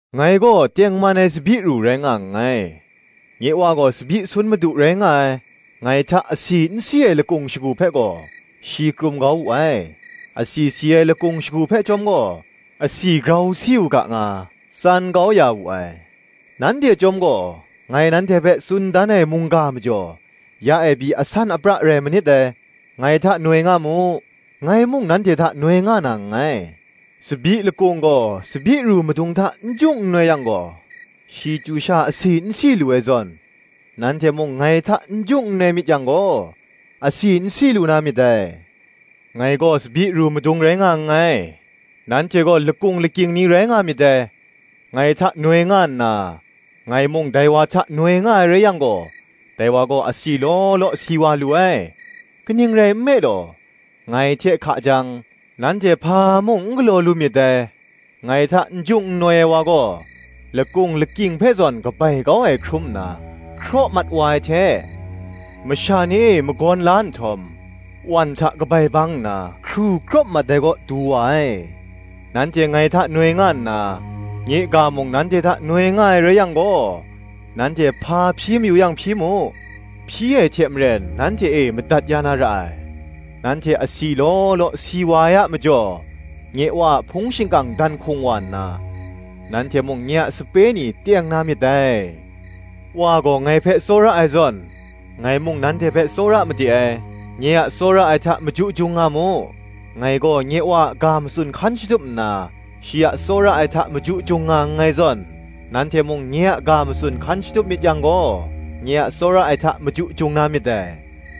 “Ngai gaw tengman ai tsabyi ru rai nga nngai, nye Wa gaw tsabyi sun madu rai nga ai. Ngai hta asi n si ai lakung shagu hpe gaw, shi krum kau wu ai: asi si ai lakung shagu hpe chyawm gaw, asi grau si u ga nga, tsan kau ya wu ai. Nanhte chyawm gaw, ngai nanhte hpe tsun dan ai mungga majaw, ya e pyi asan apra rai manit dai. Ngai hta noi nga mu, ngai mung nanhte hta noi nga na nngai. Tsabyi lakung gaw tsabyi ru madung hta n jung n noi yang gaw, shi chyu sha asi n si lu ai zawn, nanhte mung ngai hta n jung n noi myit yang gaw, asi n si lu na myit dai. “Ngai gaw tsabyi ru madung rai nga nngai, nanhte gaw lakung lakying ni rai nga myit dai: ngai hta noi nga nna, ngai mung dai wa hta noi nga ai rai yang gaw, dai wa gaw asi law law si wa lu ai: kaning rai nme law, ngai hte hka jang, nanhte hpa mung n galaw lu myit dai. Ngai hta n jung n noi ai wa gaw, lakung lakying hpe zawn kabai kau ai hkrum nna hkraw mat wa ai hte, masha ni e magawn la nhtawm, wan hta kabai bang nna, hkru krawp mat ai kaw du wa ai. Nanhte ngai hta noi nga nna, nye ga mung nanhte hta noi nga ai rai yang gaw, nanhte hpa hpyi mayu yang hpyi mu, hpyi ai hte maren nanhte e madat ya na ra ai. Nanhte asi law law si wa ai a majaw, nye Wa a hpung shingkang dan hkung wa nna, nanhte mung, nye a sape ni teng na myit dai. Wa gaw ngai hpe tsawra ai zawn, ngai mung nanhte hpe tsawra made ai: nye a tsawra ai hta maju jung nga mu. Ngai gaw nye Wa a ga matsun hkan shatup nna, shi a tsawra ai hta maju jung nga nngai zawn, nanhte mung nye a ga matsun hkan shatup myit yang gaw, nye a tsawra ai hta maju jung na myit dai.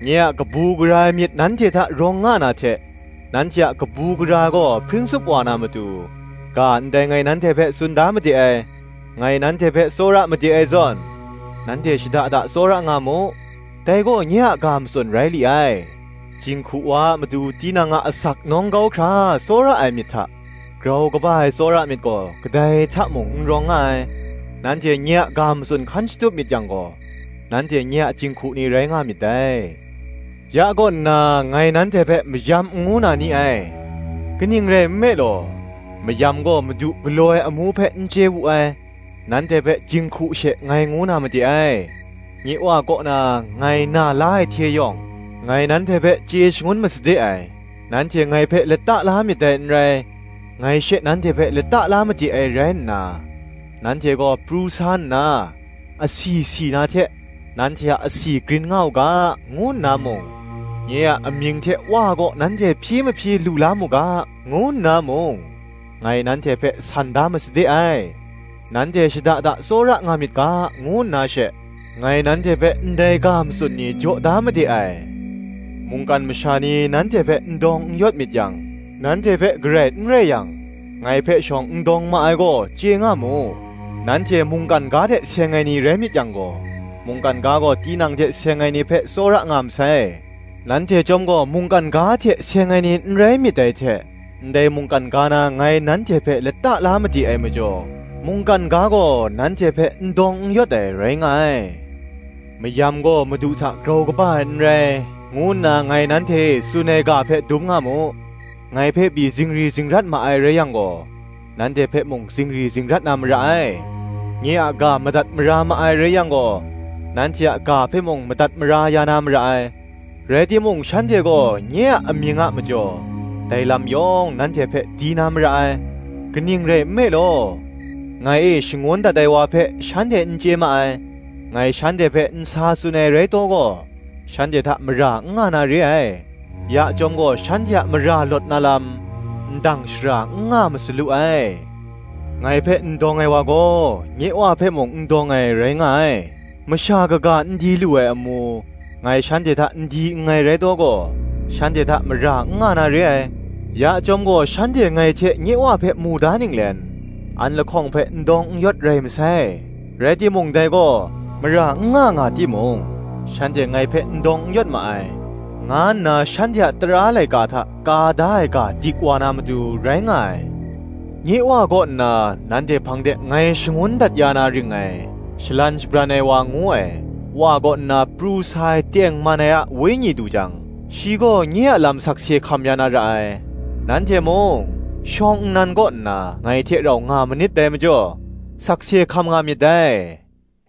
Nye a kabu gara ai myit nanhte hta rawng nga na hte, nanhte a kabu gara ai gaw hpring tup wa na matu, ga ndai ngai nanhte hpe tsun da made ai. Ngai nanhte hpe tsawra made ai zawn, nanhte shada da tsawra nga mu, dai gaw nye a ga matsun rai li ai. Jinghku wa a matu tinang a asak nawng kau hkra tsawra ai myit hta, grau kaba ai tsawra ai myit gaw kadai hta mung n rawng nga ai. Nanhte nye a ga matsun hkan shatup myit yang gaw nanhte nye a jinghku ni rai nga myit dai. Ya kaw nna ngai nanhte hpe mayam n ngu na ni ai; kaning rai nme law, mayam gaw madu galaw ai amu hpe n chye wu ai: nanhte hpe jinghku she ngai ngu na made ai; nye Wa kaw na ngai na la ai hte yawng, ngai nanhte hpe chye shangun masade ai. Nanhte ngai hpe lata la myit dai n rai, ngai she nanhte hpe lata la made ai rai nna, nanhte gaw pru sa nna, asi si na hte, nanhte a asi grin nga u ga, ngu nna mung, nye a amying hte Wa kaw nanhte hpyi mahpyi lu la mu ga, ngu nna mung, ngai nanhte hpe san da masade ai. Nanhte shada da tsawra nga myit ga, ngu nna she, ngai nanhte hpe ndai ga matsun ni jaw da made ai. “Mungkan masha ni nanhte hpe n dawng n yawt myit yang, nanhte hpe garai n rai yang, ngai hpe shawng n dawng ma ai gaw, chye nga mu. Nanhte mungkan ga hte seng ai ni rai myit yang gaw, mungkan ga gaw tinang hte seng ai ni hpe tsawra nga masai: nanhte chyawm gaw mungkan ga hte seng ai ni n rai myit dai hte, ndai mungkan ga na ngai nanhte hpe lata la made ai majaw, mungkan ga gaw nanhte hpe n dawng n yawt ai rai nga ai. Mayam gaw madu hta grau kaba ai n rai, ngu nna ngai nanhte e tsun ai ga hpe dum nga mu: ngai hpe pyi zingri zingrat ma ai rai yang gaw, nanhte hpe mung zingri zingrat na mara ai: nye a ga madat mara ma ai rai yang gaw nanhte a ga hpe mung madat mara ya na mara ai. Rai timung shanhte gaw nye amying a majaw, dai lam yawng nanhte hpe di na mara ai: kaning rai nme law, ngai e shangun dat ai wa hpe shanhte n chye ma ai. Ngai shanhte hpe n sa tsun ai rai taw gaw, shanhte hta mara n nga na re ai: ya chyawm gaw shanhte a mara lawt na lam, ndang shara n nga masalu ai. Ngai hpe n dawng ai wa gaw, nye Wa hpe mung n dawng ai, rai nga ai. Masha kaga n di lu ai amu, ngai shanhte hta n di nngai rai taw gaw, shanhte hta mara n nga na re ai: ya chyawm gaw shanhte ngai hte nye Wa hpe mu da ninglen, an lahkawng hpe n dawng n yawt rai masai. Rai timung dai gaw, Mara n nga nga timung, shanhte ngai hpe n dawng n yawt ma ai, nga nna shanhte a tara laika hta ka da ai ga dik wa na matu, rai nga ai. Nye Wa kaw nna, nanhte hpang de ngai shangun dat ya na ring ngai, Shalan Shabran ai wa ngu ai, Wa kaw nna pru sa ai tengman ai a Wenyi du jang, shi gaw nye a lam sakse hkam ya na ra ai. Nanhte mung, shawng nnan kaw nna ngai hte rau nga manit dai majaw, sakse hkam nga myit dai.